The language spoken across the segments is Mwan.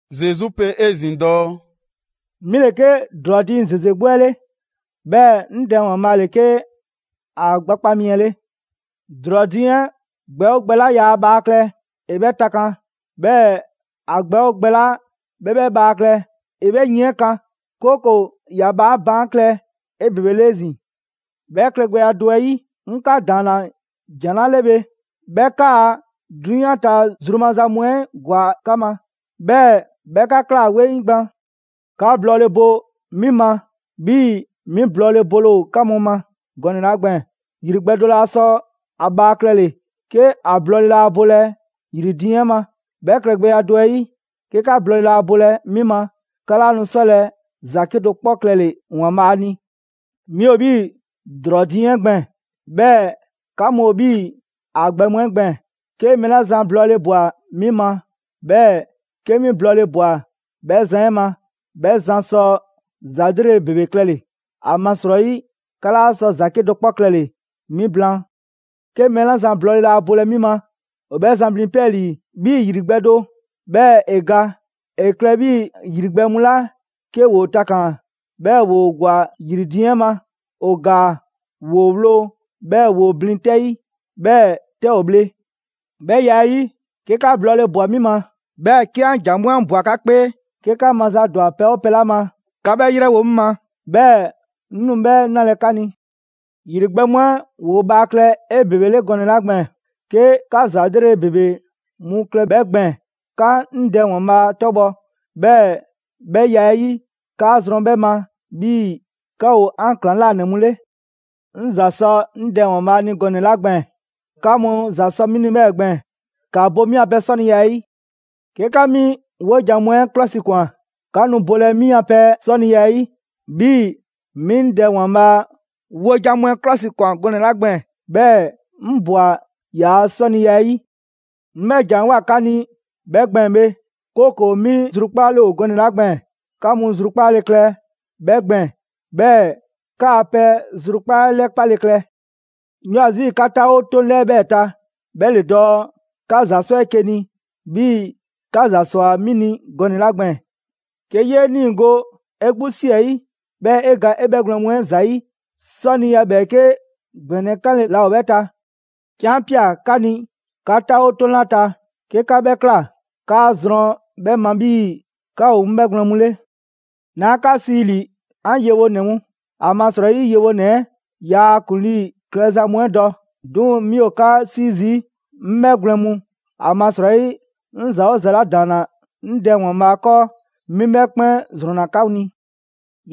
Zesu pe 'ezin‑ dɔɔ: «'Mi ‑le 'ke ‑drɔɔ diiŋ ‑zeze 'gbu 'ɛ 'le, 'bhɛɛ‑ 'ŋ Dɛ ‑Waanbhaa' ‑le 'ke ‑a gbakpa' mi 'ɛ 'le. ‑Drɔɔ diiŋ 'ɛ gbɛ 'oo gbɛ 'la yaa ‑a bhaa klɛ, ‑e 'bhɛ takan, 'bhɛɛ‑ ‑a gbɛ 'oo gbɛ 'la 'bhɛ 'bhɛ bhaa klɛ, ‑e 'bhɛ yin 'ɛ kan, 'kooko‑ ‑ya bhaa 'ɛ baan' klɛ 'ebebele 'ezin‑. 'Bhɛ klɛgbɛya do 'ɛ 'yi, 'ŋ 'ka ‑daanna ‑jan 'la 'le bhe, 'bhɛ 'kaa‑ 'drunyan ta zru maza mu 'ɛ ‑gwa 'ka ma, 'bhɛɛ‑ 'bhɛ 'ka ꞊kla 'weŋ gban. 'Ka blɔɔle bo 'mi ma 'bhii‑ 'mi blɔɔle bole ‑o 'ka mu ma gɔnɛ‑ 'la gbɛɛn‑. ‑Yri gbɛ do laa sɔ ‑a bhaa klɛle‑ 'ke ‑a blɔɔle laa bolɛ ‑yri diiŋ 'ɛ ma. 'Bhɛ klɛgbɛya do 'ɛ 'yi, 'ke 'ka blɔɔle 'laa bolɛ 'mi ma, 'ka 'laa nu 'sɔlɛ‑ ‑za 'kedo‑ 'kpɔ klɛle‑ ‑Waanbhaa ni. 'Mi ‑o 'bhii‑ ‑drɔɔ diiŋ 'ɛ gbɛɛn‑, 'bhɛɛ‑ 'ka mu ‑o 'bhii‑ ‑a gbɛ mu 'ɛ gbɛɛn‑. 'Ke mɛɛ 'la zan blɔɔle ꞊bwa 'mi ma, 'bhɛɛ‑ 'ke 'mi blɔɔle ꞊bwa 'bhɛ zan 'ɛ ma, 'bhɛ zan sɔ ‑za 'lrele‑ ‑bebe klɛle‑. ‑Amasrɔyi 'ka 'laa sɔ ‑za 'kedo‑ 'kpɔ klɛle‑ 'mi blaan. 'Ke mɛɛ 'la zan blɔɔle laa bolɛ 'mi ma, ‑o 'bhɛ zan blin 'pɛɛlii‑ 'bhii‑ ‑yri gbɛ do, 'bhɛɛ‑ ‑e ga. ‑E klɛ 'bhii‑ ‑yri gbɛ mu 'la 'ke ‑woo takaan‑, 'bhɛɛ‑ ‑woo ‑gwa ‑yri diiŋ 'ɛ ma, ‑o ‑gaa; ‑woo ‑wloo', 'bhɛɛ‑ ‑woo blin 'tɛ 'yi, 'bhɛɛ‑ 'tɛ ‑o bhle. 'Bhɛ ya 'ɛ 'yi, 'ke 'ka blɔɔle ꞊bwa 'mi ma, 'bhɛɛ‑ 'ke 'an ‑jan mu 'ɛ ꞊bwa 'ka 'kpee, 'ke 'ka maza ‑dwa pɛ 'oo pɛ 'la ma, ‑ka 'bhɛ 'yrɛwo‑ 'ŋ ma, 'bhɛɛ‑ 'ŋ nu 'bhɛ 'nalɛ‑ 'ka ni. ‑Yri gbɛ mu 'ɛ ‑woo bhaa klɛ 'ebebele gɔnɛ‑ 'la gbɛɛn‑, 'ke 'ka ‑za 'lrele‑ ‑bebe mu klɛ 'bhɛ gbɛɛn‑, 'ka 'ŋ Dɛ ‑Waanbhaa' 'tɔbhɔ, 'bhɛɛ‑ 'bhɛ ya 'ɛ 'yi, 'kaa zrɔn 'bhɛ ma 'bhii‑ 'ka ‑o 'an ‑klaŋlanɛ mu 'le. 'Ŋ ‑za sɔ 'ŋ Dɛ ‑Waanbhaa' ni gɔnɛ‑ 'la gbɛɛn‑, 'ka mu ‑za sɔ 'mi ni 'bhɛɛ‑ gbɛɛn‑. ‑Ka bo 'mi a pɛ 'sɔniya 'ɛ 'yi. 'Ke 'ka 'mi 'wojan‑ mu 'ɛ 'klɔsikwan, 'ka nu bolɛ 'mi a pɛ 'sɔniya 'ɛ 'yi, 'bhii‑ 'mi 'ŋ Dɛ ‑Waanbhaa' wojan mu 'ɛ 'klɔsikwan gɔnɛ‑ 'la gbɛɛn‑, 'bhɛɛ‑ 'ŋ ꞊bwa ‑yaa' 'sɔniya 'ɛ 'yi.» «'Ŋ 'bhɛ ‑jan 'ɛ ꞊woa 'ka ni 'bhɛ gbɛɛn‑ bhe, 'kooko‑ 'mi zrukpaale ‑o gɔnɛ‑ 'la gbɛɛn‑, 'ka mu zrukpaale klɛ 'bhɛ gbɛɛn‑, 'bhɛɛ‑ 'kaa‑ pɛ zrukpaa' 'ɛ 'lɛpale klɛ. 'Ŋ 'yoo‑ ‑a zi 'bhii‑ 'ka 'taawo 'toŋ 'lɛɛ‑ 'bhɛɛ‑ ta, 'bhɛ ‑le dɔɔ: 'Ka ‑za 'sɔ 'eke‑ ni, 'bhii‑ 'ka ‑za ꞊swa 'mi ni gɔnɛ‑ 'la gbɛɛn‑. 'Ke 'yee 'niigo‑ 'e 'gbu ꞊si 'ɛ 'yi, 'bhɛɛ‑ 'e ga 'e 'bhɛgwlɛn‑ mu 'ɛ ‑zayi', 'sɔniya 'bhɛɛke ‑gbɛnɛ 'kanle‑ ‑laa ‑o 'bhɛ ta. 'Ke 'an 'pia‑ 'ka ni 'ka 'taawo 'toŋ 'la ta, 'ke 'ka 'bhɛ ꞊kla, 'kaa‑ zrɔn 'bhɛ ma 'bhii‑ 'ka ‑o 'ŋ 'bhɛgwlɛn‑ mu 'le. 'Naa 'ka sii ‑li 'an yewonɛ mu, ‑amasrɔyi yewonɛ 'ɛ yaa ‑a ‑kuŋlii klɛza mu 'ɛ dɔ. 'Duŋ‑ 'mi ‑o 'ka 'sii zii' 'ŋ 'bhɛgwlɛn‑ mu, ‑amasrɔyi 'ŋ ‑za 'oo ‑za 'la ‑daanna 'ŋ Dɛ ‑Waanbhaa' 'kɔɔ, 'mi 'bhɛ 'kpɛn ‑zrɔnna 'ka ni.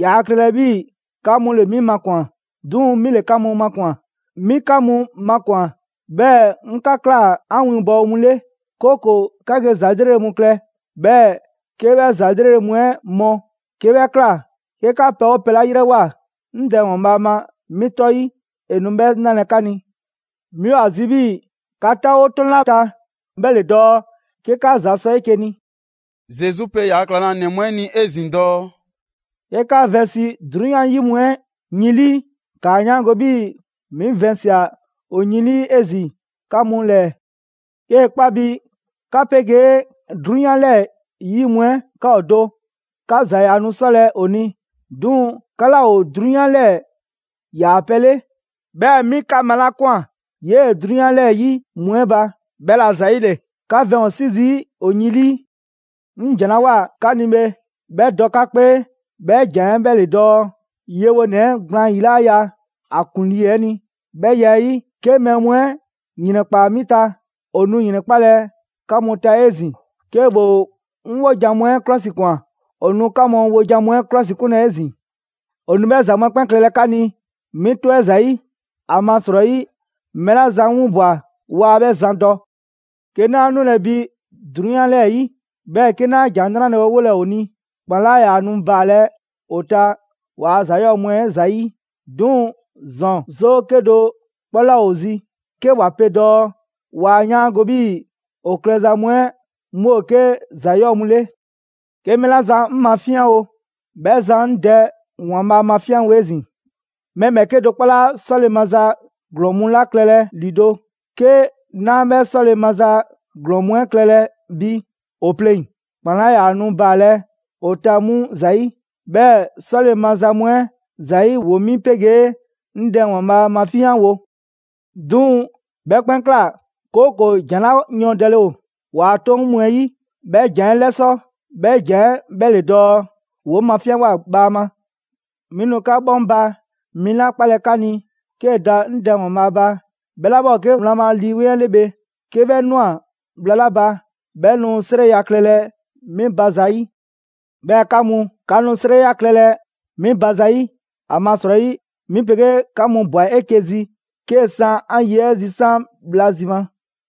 Yaa klɛlɛ 'bhii‑ 'ka mu ‑le 'mi makwan‑, 'duŋ‑ 'mi ‑le 'ka mu makwan‑. 'Mi 'ka mu makwan‑, 'bhɛɛ‑ 'ŋ 'ka ꞊kla 'an winbɔwo mu 'le. 'Kooko‑ 'ka ge ‑za 'lrele‑ mu klɛ; 'bhɛɛ‑ 'ke 'bhɛ ‑za 'lrele‑ mu 'ɛ mɔ. 'Ke 'bhɛ ꞊kla, 'ke 'ka pɛ 'oo pɛ 'la 'yrɛwoa‑ 'ŋ Dɛ ‑Waanbhaa' ma 'mi 'tɔ 'yi, ‑e nu 'bhɛ 'nalɛ‑ 'ka ni. 'Mi ‑o ‑a zi 'bhii‑ 'ka 'taawo 'toŋ 'la ta, 'bhɛ ‑le dɔɔ 'ke 'ka ‑za sɔ 'eke‑ ni.» Zesu pe ‑yaa' ‑klaŋlanɛ mu 'ɛ ni 'ezin‑ dɔɔ: «'Ke 'ka vɛnsi 'drunyan 'yi mu 'ɛ yin 'lii, ‑kaa 'yaango‑ 'bhii‑ 'mi vɛnsia‑ ‑o yin 'lii 'ezin‑ 'ka mu ‑lɛɛ. 'Kee‑ 'kpa bi 'ka 'pegee 'drunyan 'lɛɛ‑ 'yi mu 'ɛ 'ka ‑o do, 'ka ‑za ‑yaa nu 'sɔlɛ‑ ‑o ni. 'Duŋ‑ 'ka 'laa ‑o 'drunyan 'lɛɛ‑ ‑yaa pɛ 'le, 'bhɛɛ‑ 'mi 'ka malakwan 'yee‑ 'drunyan 'lɛɛ‑ 'yi mu 'ɛ ba, 'bhɛla‑ ‑zayile 'ka vɛn ‑o 'si zii' ‑o yin 'lii. 'Ŋ ‑jan 'la ꞊woa 'ka ni bhe, 'bhɛ dɔ 'ka 'kpee, 'bhɛ ‑jan 'ɛ 'bhɛ ‑le dɔɔ: ‹Yewonɛ 'ɛ gblaan ‑yi 'laa ya ‑a ‑kuŋlii 'ɛ ni›. 'Bhɛ ya 'ɛ 'yi, 'ke mɛɛ mu 'ɛ ‑yrɛnkpaa 'mi ta, ‑o nu ‑yrɛnkpalɛ 'ka mu ta 'ezin‑; 'ke ‑woo 'ŋ 'wojan‑ mu 'ɛ 'klɔsikwan, ‑o nu 'ka mu wojan mu 'ɛ 'klɔsikunlɛ 'ezin‑. ‑O nu 'bhɛ ‑za mu 'ɛ 'kpɛn klɛlɛ 'ka ni 'mi 'tɔ 'ɛ ‑zayi'; ‑amasrɔyi mɛɛ 'la zan 'ŋ 'winbwa‑ waa 'bhɛ zan dɔ. 'Ke 'naa 'nulɛ‑ bi 'drunyan 'lɛɛ‑ 'yi, 'bhɛɛ‑ 'ke 'naa ‑Jan 'Nrale‑ 'ɛ 'wolɛ‑ ‑o ni, ‑kpan 'laa ‑yaa nu baalɛ ‑o ta ‑waa' ‑za ‑yɔɔ' mu 'ɛ ‑zayi'. 'Duŋ‑ ‑zɔn 'zoo 'kedo‑ 'kpɔ 'laa ‑o zi 'ke ‑wa pe dɔɔ waa 'yaango‑ 'bhii‑ ‑o klɛza mu 'ɛ 'mu ‑o 'ke ‑za 'yɔɔ‑ mu 'le. 'Ke mɛɛ 'la zan 'ŋ mafinyanwo, 'bhɛ zan 'ŋ Dɛ ‑Waanbhaa' mafinyanwo 'ezin‑. Mɛɛ ‑bhɛɛke' do 'kpɔ 'laa 'sɔle‑ maza ‑glɔɔn mu 'la klɛlɛ ‑lido', 'ke 'naa 'bhɛ 'sɔle‑ maza ‑glɔɔn mu 'ɛ klɛlɛ bi ‑o 'pleŋ‑, ‑kpan 'laa ‑yaa nu baalɛ ‑o ta 'mu ‑zayi', 'bhɛɛ‑ 'sɔle‑ maza mu 'ɛ ‑zayi' ‑woo 'mi 'pegee 'ŋ Dɛ ‑Waanbhaa' mafinyanwo. 'Duŋ‑ 'bhɛ 'kpɛn ꞊kla, 'kooko‑ ‑jan 'la yɔɔndɛle ‑o ‑waa' 'Toŋ mu 'ɛ 'yi, 'bhɛ ‑jan 'ɛ 'lɛsɔ‑; 'bhɛ ‑jan 'ɛ 'bhɛ ‑le dɔɔ: ‹‑Woo 'ŋ mafinyanwoa bhaama.›» «'Mi nu 'ka 'Bhɔŋba‑ mi 'la 'kpalɛ‑ 'ka ni 'kee‑ da 'ŋ Dɛ ‑Waanbhaa' ba, 'bhɛ 'la 'bhɛ ‑o 'ke wlan ma Lii Weŋ 'ɛ 'le bhe. 'Ke 'bhɛ ꞊nwa bhla 'la ba, 'bhɛ nu 'srɛya‑ klɛlɛ 'mi ba zayi'. 'Bhɛɛ‑ 'ka mu, 'ka nu 'srɛya‑ klɛlɛ 'mi ba zayi', ‑amasrɔyi 'mi 'pegee 'ka mu ꞊bwa 'eke‑ zi 'kee‑ 'san 'an ye 'ɛ zisan' bhla zi ma.»